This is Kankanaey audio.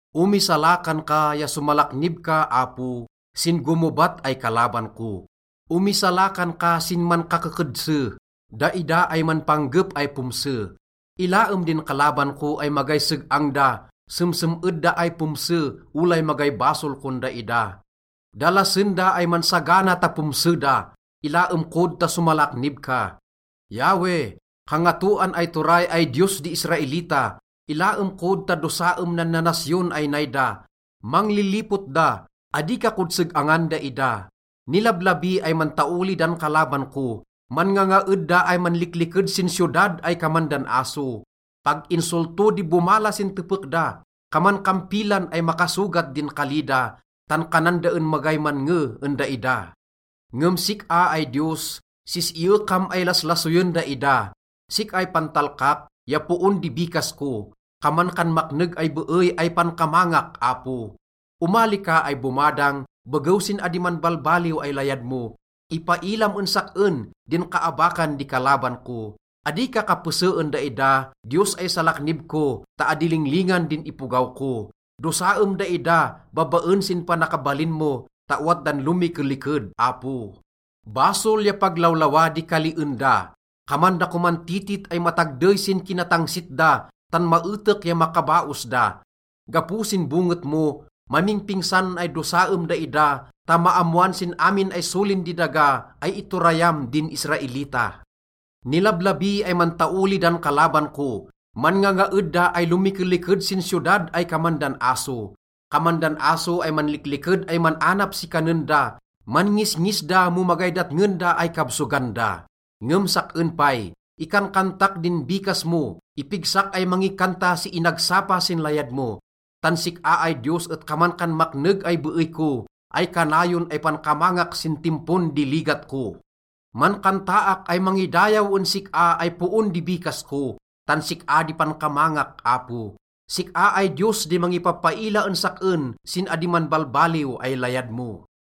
Omisalakan ka ya somalaknib ka, Apo, sin gomobat ay kalaban ko. Omisalakan ka sin mankakekedse, daida ay manpanggep ay pomse. Ilaem din kalaban ko ay magay seg-ang da, semsem-ed da ay pomse, olay magay basol kon daida. Dalasen da ay mansagana ta pomse da, ilaem kod ta somalaknib ka. Yahweh, Kangatoan ay Turay ay Diyos di Israelita, ilaem kod ta dosaem nan nanasyon ay nay da. Manglilipot da, adi ka kod seg-angan daida. Nilablabi ay mantaoli dan kalaban ko, manngangaed da ay manlikliked sin siyodad ay kaman dan aso. Pag insolto di bomala sin tepek da, kaman kampilan ay makasogat din kali da, tan kanan da en magay mannge en daida. Ngem sik-a ay Diyos, sis-iyekam ay laslasoyen daida. Sik-ay pantalkak ya poon di bikas ko, kaman kan makneg ay beey ay pankamangak, Apo. Omali ka ay bomadang begew sin adi manbalbaliw ay layad mo, ipailam en sak-en din kaabakan di kalaban ko. Adi ka kapese en daida, Diyos ay salaknib ko, ta adi linglingan din ipogaw ko. Dosaem daida babaen sin panakabalin mo ta owat dan lomikeliked, Apo. Basol ya pag lawlawa di kalien da. Kaman da koman titit ay matagdey sin kinatangsit da, tan maetek ya makabaos da. Gapo sin bonget mo, mamingpingsan ay dosaem daida ta maammoan sin amin ay solin di daga ay iturayam din Israelita. Nilablabi ay mantaoli dan kalaban ko. Manngangaed da ay lomikeliked sin siyodad ay kaman dan aso. Kaman dan aso ay manlikliked ay man-anap si kanen da, manngisngis da mo magay datngen da ay kabsogan da. Ngem sak-en pay, ikankantak din bikas mo, ipigsak ay mangikanta si inagsapa sin layad mo. Tan sik-a ay Diyos et kaman kan makneg ay beey ko ay kanayon ay pankamangak sin timpon di ligat ko. Mankantaak ay mangidayaw en sik-a ay poon di bikas ko, tan sik-a di pankamangak, Apo. Sik-a ay Diyos di mangipappaila en sak-en sin adi manbalbaliw ay layad mo.